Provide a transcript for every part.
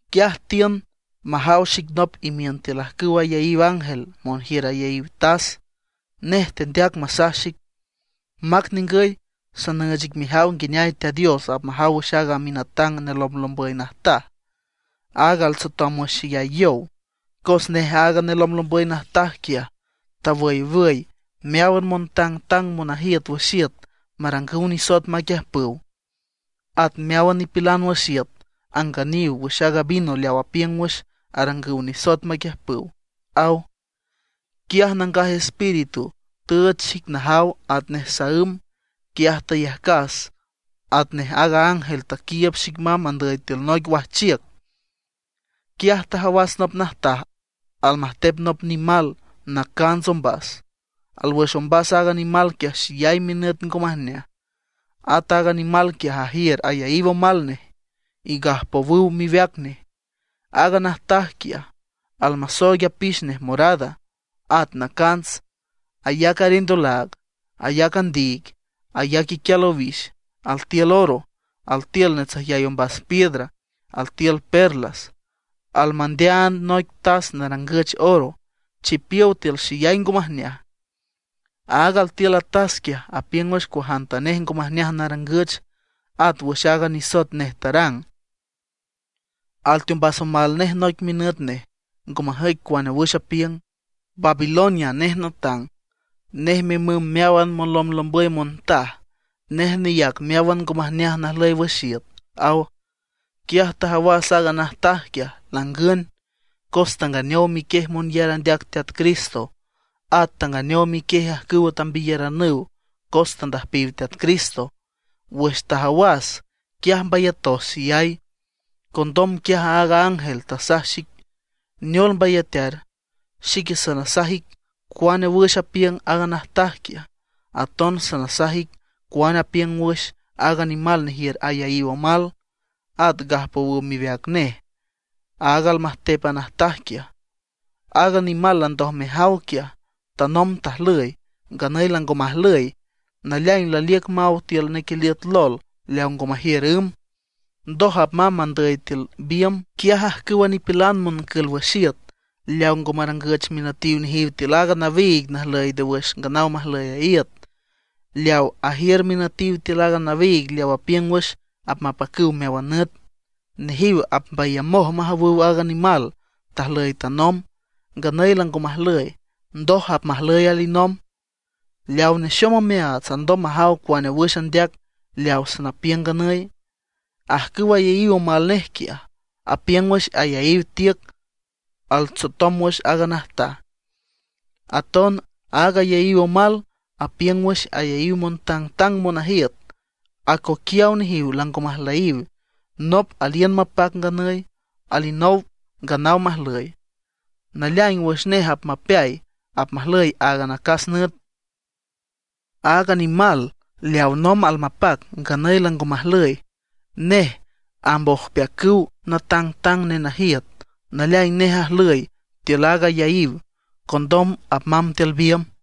Quiaj tiün majaw xic nop imiün tiül ajcüwa ayaíw ángeles monjiür ayaíw tas. Nej tendeac masaj xic: ―Mac ningüy, sanüüch ic mejaw nguineay Teat Dios apmajaw wüx aaga minatang nelomblombüy najtaj, aaga altsotom wüx xeyay yow. Cos nej aaga nelomblombüy najtaj quiaj tawüywüy meáwan montangtang monajiüt wüx iüt marangüw nisoet maquiüjpüw. At meáwan nipilan wüx iüt angüniw wüx aaga vino leaw apiüng wüx arangüw nisoet maquiüjpüw ―aw. Quiaj Nangaj Espíritu tüüch xic najaw atnej saǘm. Quiaj tayajcas atnej aaga ángel taquiiüb xic mamb andüy tiül noic wajchiüc. Quiaj tajawas nop najtaj almajtep nop nimal nacants ombas. Alwüx ombas aaga nimal quiaj xeyay minüt ngo majneaj. At aaga nimal quiaj ajiür ayaíw omal nej y gajpowüw miweac nej. Aaga najtaj quiaj almasooig apix nej morada, at nacants. Ayac arend olaag, ayac andiig, ayac iquial owix. Altiül oro, altiül natsüjyay ombas piedra, altiül perlas. Almandeaand noic tas narangüch oro, chipiow tiül xeyay ngo majneaj. Aaga altiül a tas quiaj, apiüng wüx cuajantanej ngo majneaj narangüch, at wüx aaga nisoet nej tarang. Alteombas omal nej noic minüt nej ngo majüic cuane wüx apiüng. Aag ayaj apiüng: “Babilonia nej natang, nej mimüm meáwan monlomblombüy montaj, nej neyac meáwan ngo majneaj najlüy wüx iüt”, aw. Quiaj tajawas aaga najtaj quiaj langün, cos tanganeow miquiej monyar andeac Teat Cristo. At tanganeow miquiej ajcüwa tambiyaranüw cos tandüjpiw Teat Cristo. Wüx tajawas, quiaj mbayatos xeyay. Condom quiaj aaga ángel tasaj xic: ―¿Neol mbayatear? Xique sanasaj ic cuane wüx apiüng aaga najtaj quiaj. Aton sanasaj ic cuane apiüng wüx aaga nimal nejiür ayaíw omal, at gajpowüw miweac nej, aaga almajtep a najtaj quiaj. Aaga nimal landoj mejaw quiaj, tanomb tajlüy, nganüy lango majlüy. Naleaing laliüc maw tiül nequiliüt lol leaw ngo majiür ümb, ndoj apmamb andüy tiül biümb. Quiaj ajcüwa nipilan moncül wüx iüt, leawa ngo marangüch minütiw nejiw tiül aaga nawiig najlüy nde wüx nganaw majlüy iüt, leaw ajiür minütiw tiül aaga nawiig leaw apiüng wüx apmapacüw meáwan nüt; nejiw apmbayamoj majawüw aaga nimal tajlüy tanomb, nganüy lango majlüy, ndoj apmajlüy alinomb. ’Leaw nexom omeaats alndom majaw cuane wüx andeac leaw sanapiüng nganüy: Ajcüw ayaíw omal nej quiaj, apiüng wüx ayaíw tiüc altsotom wüx aaga najtaj. Aton aaga ayaíw omal apiüng wüx ayaíw montangtang monajiüt. Acoquiaw nejiw lango majlüyiw, nop aliün mapac nganüy, alinop nganaw majlüy. Naleaing wüx nej apmapeay apmajlüy áagan acas nüt. Aaga nimal leaw nomb almapac nganüy lango majlüy, nej amb ojpeacüw natangtang nenajiüt, naleaing nej ajlüy tiül aaga ayaíw, condom apmamb tiül biümb.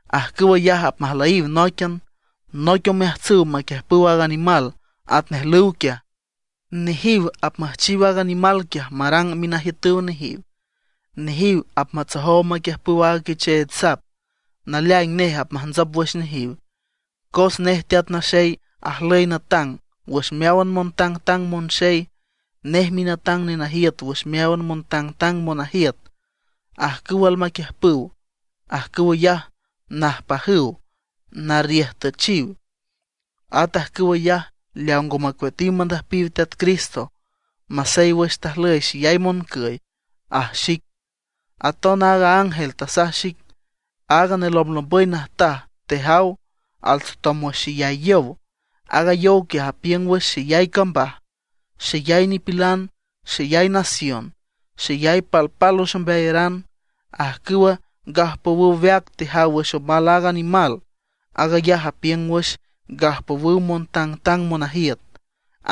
Ajcüw ayaj apmajlüyiw nóiquian, noic omeajtsüw maquiüjpüw aaga nimal atnej lüw quiaj. Nejiw apmüjchiw aaga nimal quiaj marang minajiütüw nejiw. Nejiw apmatsojow maquiüjpüw aaga Quicheech Sap. Naleaing nej apmajntsop wüx nejiw, cos nej Teat Naxey ajlüy natang wüx meáwan montangtang monxey; nej minatang nenajiüt wüx meáwan montangtang monajiüt. Ajcüwa almaquiüjpüw, ajcüw ayaj najpajüw, narriüjtüchiw; at ajcüw ayaj leaw ngo macueatiw mandüjpiw Teat Cristo, masey wüx tajlüy xeyay moncüy ―aj xic. Aton aaga ángel tasaj xic: ―Aaga nelomblombüy najtaj tejaw altsotom wüx xeyay yow, aaga yow quiaj apiüng wüx xeyay cambaj, xeyay nipilan, xeyay nación, xeyay palpálwüx ombeayaran. Ajcüwa gajpowüw weac tejaw wüx omal aaga nimal, aag ayaj apiüng wüx gajpowüw montangtang monajiüt.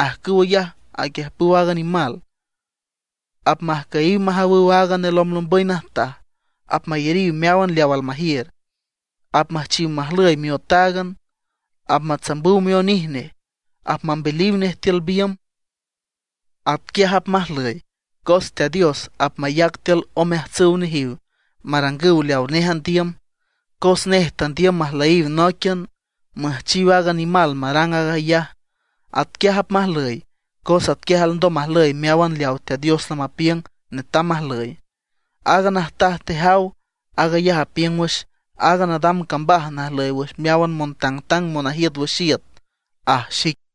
Ajcüw ayaj aquiüjpüw aaga nimal, apmajcüyiw majawüw aaga nelomblombüy najtaj, apmayariw meáwan leaw almajiür, apmüjchiw majlüy miotáagan, apmatsambüw mionij nej y apmambeliw nej tiül biümb. Atquiaj apmajlüy, cos Teat Dios apmayac tiül omeajtsüw nejiw marangüw leawa nej andiüm. Cos nej tandiüm majlüyiw nóiquian, müjchiw aaga nimal marang aag ayaj. Atquiaj apmajlüy cos atquiaj alndom majlüy meáwan leawa Teat Dios lamapiüng netam majlüy. Aaga najtaj tejaw, aag ayaj apiüng wüx aaga nadam cambaj najlüy wüx meáwan montangtang monajiüt wüx iüt ―aj xic.